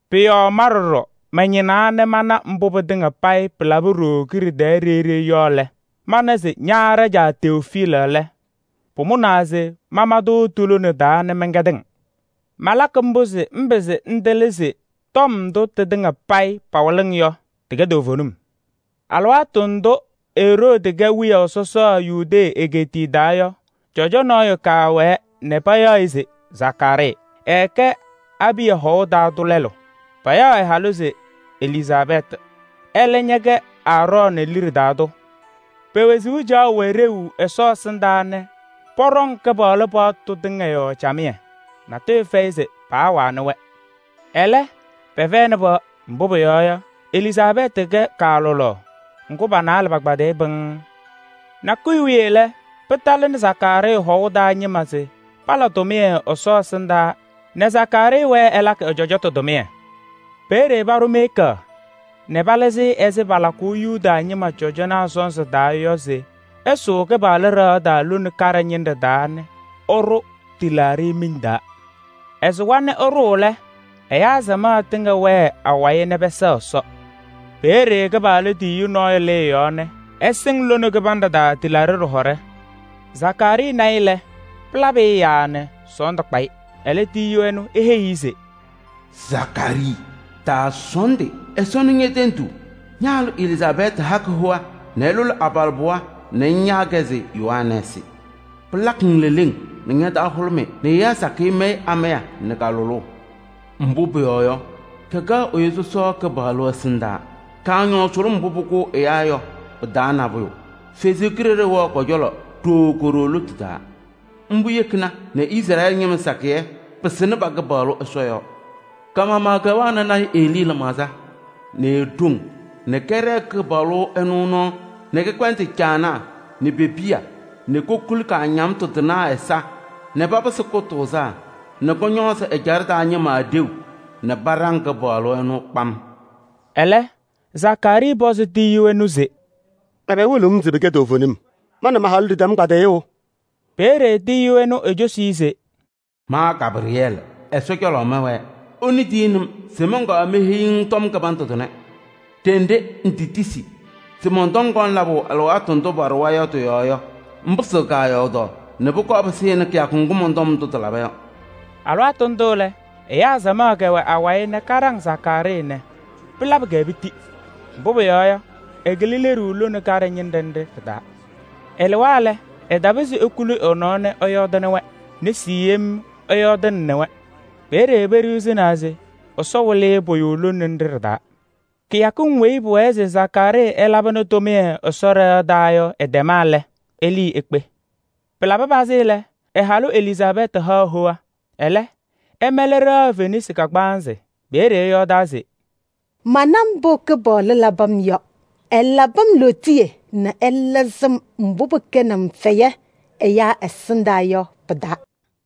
Pʋ-yɔɔ ma ɖɔɖɔ mañɩnaa nɛ mana mbʋ pɩtɩŋa payɩ pɩlaba ɖooo kiɖe tɛɛ ɖeyi ɖeyi yɔ lɛ, mana se ña ɖajaa Tewofiili lɛ, pʋmʋnaa se mama-tʋ ti-lona taa nɛ mɛnkɛdɩ-ŋ. Malakɩ mbʋ se ŋpɩzɩ ŋtɩlɩ se tɔm ndʋ tɩtɩŋa payɩ pawɩlɩ-ŋ yɔ, tɩkɛ toovenim. Alɩwaatʋ ndʋ Eroodi kɛ wiyaʋ sɔsɔ Yudee egeetiye taa yɔ, cɔjɔ nɔɔyʋ kɛwɛɛ, payaɣ-ɩ se Zakaarii. Ɛɛkɛ Abiya hɔɔlʋʋ taa tʋ lɛlʋ. Payaɣ ɛ-halʋ se Elizaabɛɛtɩ, ɛlɛ ñɛkɛ Aarɔɔnɩ liɖe taa tʋ. Pe-wezuu caɣʋ wɛ ɖeu Ɛsɔ ɛsɩndaa nɛ pɔɖɔŋ Kɩpaɣlʋ paɣtʋ tɩŋa yɔɔ camɩyɛ, natʋyʋ fɛyɩ se paawanɩ-wɛ. Ɛlɛ, pɛfɛyɩnɩ pɩɣa. Mbʋ pʋyɔɔ yɔ, Elizaabɛɛtɩ kɛ kaalʋlaɣ, ŋgʋ pa-naalɛ pakpaɖɩyɩ pɩŋŋ. Nakʋyʋ wiye pɩtalɩnɩ Zakaarii hɔɔlʋʋ taa ñɩma se pala tʋmɩyɛ Ɛsɔ ɛsɩndaa nɛ Zakaarii wɛɛ ɛlakɩ ɛ-cɔjɔtʋ tʋmɩyɛ. Peeye paɖʋ miika nɛ palɩzɩ-ɩ ɛzɩ palakʋʋ Yuda ñɩma cɔjɔnaa sɔnzɩ yɔ se ɛsʋʋ Kɩpaɣlʋ ɖɩɣa taa lone kaɖɛ ñɩnɖɛ taa nɛ ɛɖʋ tɩlaaɖɩ miŋ taa. Ɛsʋwa nɛ ɛɖʋʋ lɛ, ɛyaa samaɣ tɩŋa wɛɛ awayɩ nɛ pɛsɛɣ Ɛsɔ. Peeye Kɩpaɣlʋ tiyiyu nɔɔyʋ lɩ ɛ-yɔɔ nɛ ɛsɩŋ lone kɩbanɖɛ taa tɩlaaɖɩ ɖɩhɔɖɛ. Zakaarii na-ɩ lɛ, pɩlabɩ-ɩ yaaa nɛ sɔɔndʋ kpa-ɩ. Ɛlɛ, tiyiyu ɛnʋ eheyi-i se: “Zakaarii! Taasɔɔndɩ, Ɛsɔ nɩ ñe-tenduu. Ña-halʋ Elizaabɛɛtɩ hakɩ hoa nɛ ɛlʋlɩ abalɩbɩɣa nɛ ŋyaa-kɛ se Yohanɛɛsɩ. Pɩlakɩ-ŋ leleŋ nɛ ña-taa hʋlʋmɩ nɛ ɛyaa sakɩyɛ mayɩ amaya nɛ ka-lʋlʋʋ. Mbʋ pʋyɔɔ yɔ, kɛkɛɣ sɔsɔ Kɩpaɣlʋ ɛsɩndaa. Kaañɔʋ vɛɛ yaa sʋlʋm lɛɛbʋ mbʋ pʋkʋʋ ɛyaa yɔ. Ɛsɔ Kalɩzaɣ wɛɣ kɔ-cɔlɔ ɖooo ko-ɖoo lotu taa. Ŋga yekina nɛ Izrɛɛlɩ ñɩma sakɩyɛ pɩsɩnɩ pa-Kɩpaɣlʋ Ɛsɔ yɔɔ. Ka-maɣmaɣ kɛwɛɣnɩ lɔɔyaɣ tʋ Elii lɩmaɣza nɛ e-ɖoŋ nɛ kɛɖɛɛ Kɩpaɣlʋ ɛnʋ nɔɔ nɛ kɛkpɛndɩ caanaa nɛ pe-piya nɛ kokuli kaañamtʋ tɩnaa ɛza nɛ papɩsɩ kʋtʋʋzaa nɛ kɔñɔɔzɩ ɛjaɖɛ taa ñɩma ɖeu nɛ paɖaŋ Kɩpaɣlʋ ɛnʋ kpam.” Ɛlɛ, Zakaarii pɔzɩ tiyiyu ɛnʋ se: “Ɛbɛ wɩlɩɣ-m se pɩkɛ toovenim? Ma nɛ ma-halʋ ɖɩtɛm kpadɩyʋʋ!” Peeye tiyiyu ɛnʋ ecosi-i se: “Ma Gabrɩyɛɛlɩ, Ɛsɔ cɔlɔ mɛwɛɛ. Ɛnʋ tiyini-m se mɔnkɔɔ meheyi-ŋ tɔm kɩbandʋ tʋnɛ. Ɖenɖe ŋtetisi se mɔn-tɔm kɔŋ labʋ alɩwaatʋ ndʋ paɖʋwa yɔ tɩ-yɔɔ yɔ, ŋpɩsɩɣ kaayɔɔdaɣ nɛ pʋkɔɔ pɩsɩnɩ kɩyakʋ ŋgʋ mɔn-tɔm ndʋ tɩlaba yɔ.” Alɩwaatʋ ndʋ lɛ, ɛyaa samaɣ kɛwɛ awayɩ nɛ kaɖaŋ Zakaarii nɛ pɩlabɩ-kɛ piti. Mbʋ pʋyɔɔ yɔ, ɛkɩlɩ leɖuu lone kaɖɛ ñɩnɖɛ nɖɩ ɖɩ-taa. Ɛlɩwa lɛ, ɛtapɩzɩ ekuli ɛ-nɔɔ nɛ ɛyɔɔdɩnɩ-wɛ. Nesi yem ɛyɔɔɖaɣnɩ-wɛ. Peeye peɖiɣzinaa se Ɛsɔ wɩlɩ-ɩ pʋyʋ lone nɖɩ ɖɩ-taa. Kɩyakɩŋ weyi pʋwɛɛ se Zakaarii ɛlabɩnɩ tʋmɩyɛ Ɛsɔ ɖɩɣa taa yɔ ɩtɛma lɛ, ɛlɩɩ ekpe. Pɩlabɩ pazɩ lɛ, ɛ-halʋ Elizaabɛɛtɩ haɣ hoa. Ɛlɛ, ɛmɛlɩ ɖɩɣa fenasɩ kagbaanzɩ. Peeye ɛyɔɔdaa se: “Mana mbʋ Kɩpaɣlʋ labɩ-m yɔ: ɛlabɩ-m lootiye nɛ ɛlɩzɩ-m mbʋ pɩkɛnɩ-m fɛyɛ ɛyaa ɛsɩndaa yɔ pɩ-taa.”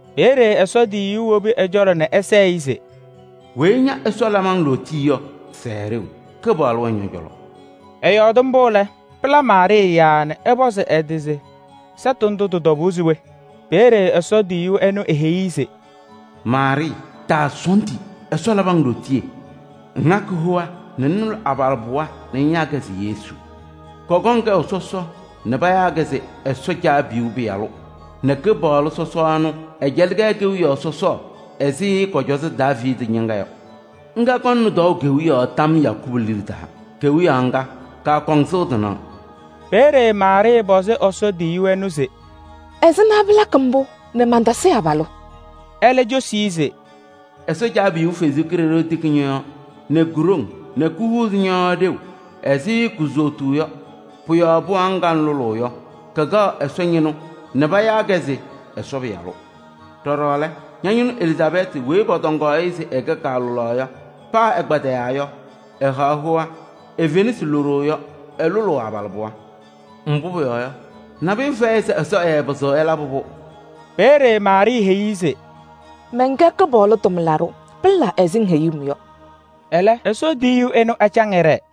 Peeye Ɛsɔ tiyiyu wobi ɛ-cɔlɔ nɛ ɛsɛɛ-ɩ se: “Weyi ña Ɛsɔ labɩ-ŋ lootiye yɔ, sɛɛ ɖeu! Kɩpaɣlʋ wɛ ñɔ-cɔlɔ.” Ɛyɔɔdɩ mbʋ lɛ, pɩla Maarɩɩ yaaa nɛ ɛpɔzɩ ɛ-tɩ se sɛtʋ ndʋ tɩ-tɔbʋʋ se we? Peeye Ɛsɔ tiyiyu ɛnʋ eheyi-i se: “Maarɩɩ! Taasɔɔndɩ, Ɛsɔ labɩ-ŋ lootiye. Ŋhakɩ hoa nɛ ŋlʋlɩ abalɩbɩɣa nɛ ŋyaa-kɛ se Yesu. Kɔkɔŋ kɛʋ sɔsɔ nɛ payaa-kɛ se Ɛsɔ Caabiyuu Pɩyalʋ nɛ Kɩpaɣlʋ Ɛsɔ ɛnʋ, ɛcɛlɩ-kɛ kewiyaɣ sɔsɔɔ ɛzɩ kɔ-cɔzɔ Daaviidi ñɩŋga yɔ. Ŋga kɔŋnɩ tɔɔʋ kewiyaɣ tam Yakubu liɖe taa. Ke-kewiyaɣ ŋga, kaakɔŋ sɩʋ tɩnaɣ.” Peeye Maarɩɩ pɔzɩ Ɛsɔ tiyiyu ɛnʋ se: “Ɛzɩma pɩlakɩ mbʋ nɛ mantasɩ abalʋ?” Ɛlɛ cosi-i se: “Ɛsɔ Caabiyuu Kalɩzaɣ tiki ñɔ-yɔɔ nɛ ko-ɖoŋ nɛ kohuuzi ñɔ-yɔɔ ɖeu ɛzɩ kuzotuu yɔ. Pʋ-yɔɔ pɩɣa ŋga ŋlʋlʋʋ yɔ, kɛkɛɣ Ɛsɔ ñɩnʋ nɛ payaa-kɛ se: Ɛsɔ Pɩyalʋ. Ɖɔɖɔ lɛ, ña-ñɩnʋ Elizaabɛɛtɩ weyi pɔtɔŋaɣ-ɩ se ɛkɛ kaalʋlaɣ yɔ, paa ɛkpadɩyaa yɔ, ɛhaɣ hoa. E-fenasɩ loɖo yɔ, ɛlʋlʋʋ abalɩbɩɣa. Mbʋ pʋyɔɔ yɔ, nabʋyʋ fɛyɩ se Ɛsɔ ɛɛpɩzɩɣ ɛlabɩ-pʋ.” Peeye Maarɩɩ heyi-i se: “Mɛnkɛ Kɩpaɣlʋ tʋmlaɖʋ. Pɩla ɛzɩ ŋheyuu-m yɔ.” Ɛlɛ Ɛsɔ tiyiyu ɛnʋ ɛcaŋ ɛɖɛɛ.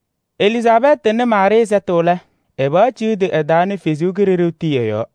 Elizaabɛɛtɩ nɩ Maarɩɩ sɛtʋ lɛ, ɛ-pɩɣa ciɣdi ɛ-taa nɛ Ɛsɔ Kalɩzaɣ tii ɛ-yɔɔ.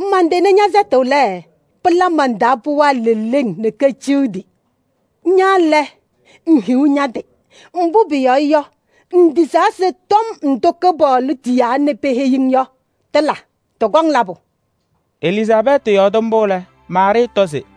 Mantɩnɩ ñɛ-sɛtʋ lɛ, pɩla man-taa pɩɣa leleŋ nɛ keciɣdi. Ña lɛ, ŋhiɣ ña-tɩ! Mbʋ pʋyɔɔ yɔ, ŋtisaa se tɔm ndʋ Kɩpaɣlʋ tiyaa nɛ peheyi-ŋ yɔ, tɩkɔŋ labʋ yɔ.” Elizaabɛɛtɩ yɔɔdɩ mbʋ lɛ, Maarɩɩ tɔ se: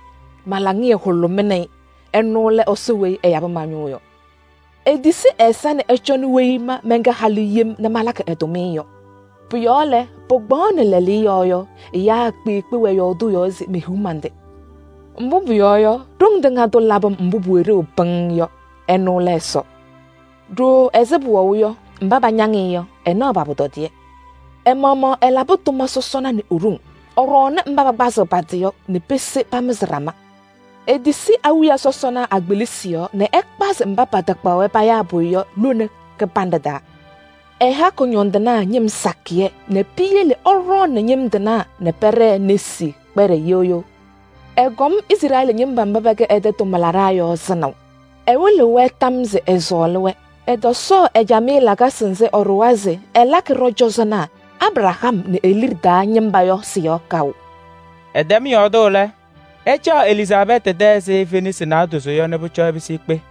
ma-laŋɩyɛ hʋlʋmɩnɩ-ɩ. Ɛnʋ lɛ Ɛsɔ weyi ɛyabɩ ma-ñʋʋ yɔ. Etisi ɛ-ɛza nɛ ɛcɔnɩ weyi ma mɛnkɛ halʋ yem nɛ malakɩ ɛ-tʋmɩyɛ yɔ. Pʋ-yɔɔ lɛ, pɩkpaɣʋnɩ lɛɛlɛɛyɔ yɔ, ɛyaa kpeekpe wɛɣ yɔɔdʋʋ yɔɔ se mehiɣ man-tɩ. Mbʋ pʋyɔɔ yɔ, Ɖoŋ Tɩŋa Tʋ labɩ-m mbʋ pʋwɛ ɖeu pɩŋŋ yɔ. Ɛnʋ lɛ Ɛsɔ. Ɖooo ɛzɩ pʋwɛʋ yɔ, mba pañaŋ-ɩ yɔ, ɛnaɣ pa-pʋtɔdɩyɛ. Ɛ-maɣmaɣ ɛlabɩ tʋma sɔsɔna nɛ e-ɖoŋ: ɛɖɔɔnɩ mba pakpazɩɣ pa-tɩ yɔ nɛ pese pamɩzɩ ɖama. Etisi awiya sɔsɔna a-kpelisi yɔɔ nɛ ɛkpazɩ mba patakpaɣ-wɛ payaa pʋyʋ yɔ lone kɩbanɖɛ taa. Ɛha kʋñɔndɩnaa ñɩm sakɩyɛ nɛ piyele ɛɖɔɔnɩ ñɩm tɩnaa nɛ pɛɖɛɛ nesi kpɛɖɛ yeɣ yeɣ. Ɛkɔm ɛ-ɛyaa Izrɛɛlɩ ñɩma ɖa sɩnaʋ. Ɛtɔsɔɔ ɛ-camɩyɛ lakasɩ nzɩ ɛɖʋwa se ɛlakɩ Abraham nɛ e-liɖe taa ñɩma yɔ sɩ-yɔɔ kaʋ.” Ɛtɛm yɔɔdʋʋ lɛ, ɛcaɣ Elizaabɛɛtɩ tɛ ɛzɩ fenasɩ naadozo yɔ nɛ pʋcɔ ɛpɩsɩ ekpe.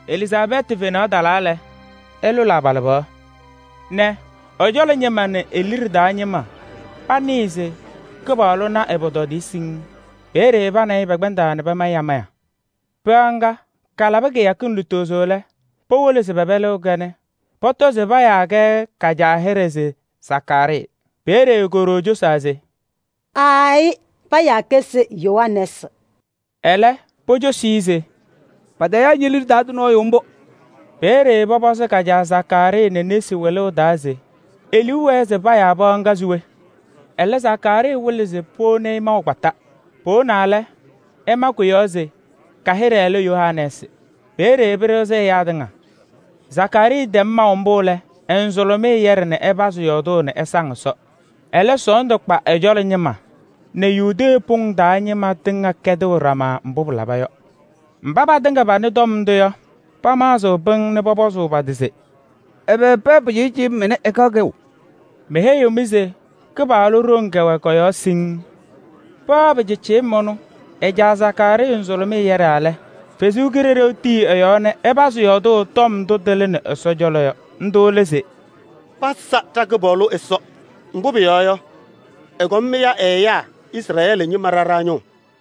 Elizaabɛɛtɩ fenaɣ talaa lɛ, ɛlʋlɩ abalɩbɩɣa nɛ ɛ-cɔlɔ ñɩma nɛ e-liɖe taa ñɩma panɩɩ se Kɩpaɣlʋ na ɛ-pʋtɔdɩyɛ siŋŋ. Peeye pa nɛ ɩ pɛkpɛndaa pamayɩ amaya. Pɩɣa ŋga kalabɩ kɩyakɩŋ lutozo lɛ, powolo se pɛpɛlɩɣ-kɛ nɛ pɔtɔ se payaa-kɛ ka-caa hɩɖɛ se Zakaarii. Peeye ko-ɖoo cosaa se: “Aayɩ, payaa-kɛ se Yohanɛɛsɩ.” Ɛlɛ, pocosi-i se: “Patayaa ñe-liɖe taa tʋ nɔɔyʋ mbʋ.” Peeye pɔpɔzɩ ka-caa Zakaarii nɛ nesi wɩlʋʋ taa se e-liu wɛɛ se payaa ɛ-pɩɣa se we? Ɛlɛ Zakaarii wɩlɩ se powoni-i maʋ kpata. Powonaa lɛ, ɛma kʋ-yɔɔ se: “Ka-hɩɖɛ lɛ Yohanɛɛsɩ.” Peeye pɩɖɩɣzɩ ɛyaa tɩŋa. Zakaarii tɛm maʋ mbʋ lɛ, ɛ-nzʋlɩmɩyɛ tɩyɛdɩ nɛ ɛpazɩ yɔɔdʋʋ nɛ ɛsaŋ Ɛsɔ. Ɛlɛ sɔɔndʋ kpa ɛ-cɔlɔ ñɩma nɛ Yudee pʋŋ taa ñɩma tɩŋa kɛdɩɣ ɖama mbʋ pɩlaba yɔ. Mba patɩŋa panɩ tɔm ndʋ yɔ, pamaɣzɩ pɩŋŋ nɛ pɔpɔzʋʋ pa-tɩ se: “Ɛbɛ pɩɣa pɩcɩɩcɩyɩm ɛnɛ ɛkaɣ kɛʋ?” Meheyiɣ-mɩ se Kɩpaɣlʋ ɖoŋ kɛwɛ kɔ-yɔɔ siŋŋ. Pɩɣa pɩcɩɩcɩyɩm ɛnʋ ɛ-caa Zakaarii nzʋlʋmɩyɛ yɛɖaa lɛ, Ɛsɔ Kalɩzaɣ tii ɛ-yɔɔ nɛ ɛpazɩ yɔɔdʋʋ tɔm ndʋ tɩlɩnɩ Ɛsɔ cɔlɔ yɔ. Ndʋ lɛ se: “Pasa ɖa-Kɩpaɣlʋ Ɛsɔ, mbʋ pʋyɔɔ yɔ, ɛkɔm ɛya ɛ-ɛyaa Izrɛɛlɩ ñɩma ɖa ɖa-ñʋʋ.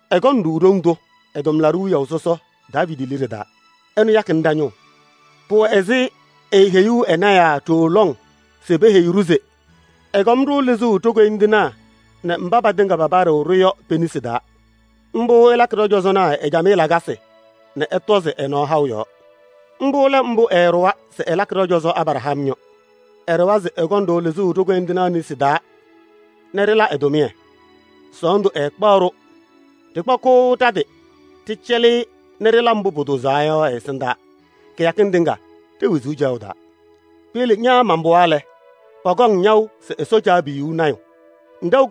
Ɛkɔnɩ-ɖʋ ɖoŋ tʋ ɛ-tʋmlaɖʋ wiyaʋ sɔsɔ Daaviidi liɖe taa. Ɛnʋ yakɩnɩ ɖa-ñʋʋ. Pʋwɛ ɛzɩ eeheyuu ɛ-lɔɔyɩsɩ tɩnaa ɖooo lɔŋ se peheyi-ɖʋ se ɛkɔŋ-ɖʋ lɩzʋʋ ɖo-koyindinaa nɛ mba patɩŋa papaɖɩɣ-ɖʋ yɔ pe-nesi taa yɔ. Mbʋ ɛlakɩ ɖɔ-cɔzɔnaa ɛ-camɩyɛ lakasɩ nɛ ɛtɔzɩ ɛ-nɔɔ haʋ yɔɔ. Mbʋ lɛ mbʋ ɛɛɖʋwa se ɛlakɩ ɖɔ-cɔzɔ Abraham yɔ. Ɛɖʋwa se ɛkɔŋ-ɖʋ lɩzʋʋ ɖo-koyindinaa nesi taa nɛ ɖɩla ɛ-tʋmɩyɛ, sɔɔndʋ ɛɛkpaɣ-ɖʋ. Ɖɩkpakɩɣ ɖa-tɩ ɖɩcɛlɩ-ɩ nɛ ɖɩla mbʋ pʋtʋʋzaa yɔ ɛ-ɛsɩndaa kɩyakɩŋ tɩŋa ɖe-wezuu caɣʋ taa. Piyele ña man-pɩɣa lɛ, pakaɣ-ŋ yaʋ se Ɛsɔ Caabiyuu lɔɔyaɣ tʋ.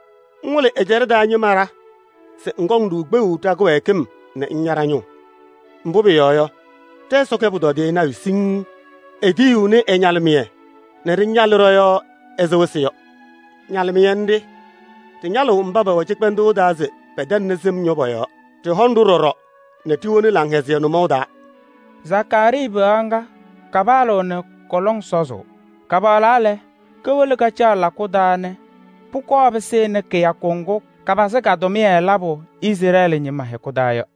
ŋwɩlɩ ɛ-ɛjaɖɛ taa ñɩma ɖa se ɛkɔŋ-ɖʋ kpeɣu ɖa-kɩwɛɛkɩm nɛ ɛya ɖa-ñʋʋ. Mbʋ pʋyɔɔ yɔ, ɖɛ-Ɛsɔ kɛ pʋtɔdɩyɛ nayʋ siŋŋ: etiyiɣni ɛ-ñalɩmɩyɛ nɛ ɖɩñalɩ ɖɔ-yɔɔ ɛzɩ wɩsɩ yɔ. Ñalɩmɩyɛ nɖɩ ɖɩñalɩɣ mba pɛwɛ cɩkpɛndʋʋ taa se pɛtɛŋnɩ sɩm yɔ pɔ-yɔɔ. Ɖɩhɔŋ-ɖʋ ɖɔɖɔ nɛ ɖiwoni laŋhɛzɩyɛ nʋmɔʋ taa.” Zakaarii pɩɣa ŋga kapaɣlaɣ nɛ kɔ-lɔŋ sɔzʋʋ. Kapaɣlaa lɛ, kowolo kacaɣ lakʋ taa nɛ pʋkɔɔ pɩsɩnɩ kɩyakʋ ŋgʋ kapazɩ ka-tʋmɩyɛ labʋ Izrɛɛlɩ ñɩma hɛkʋ taa yɔ.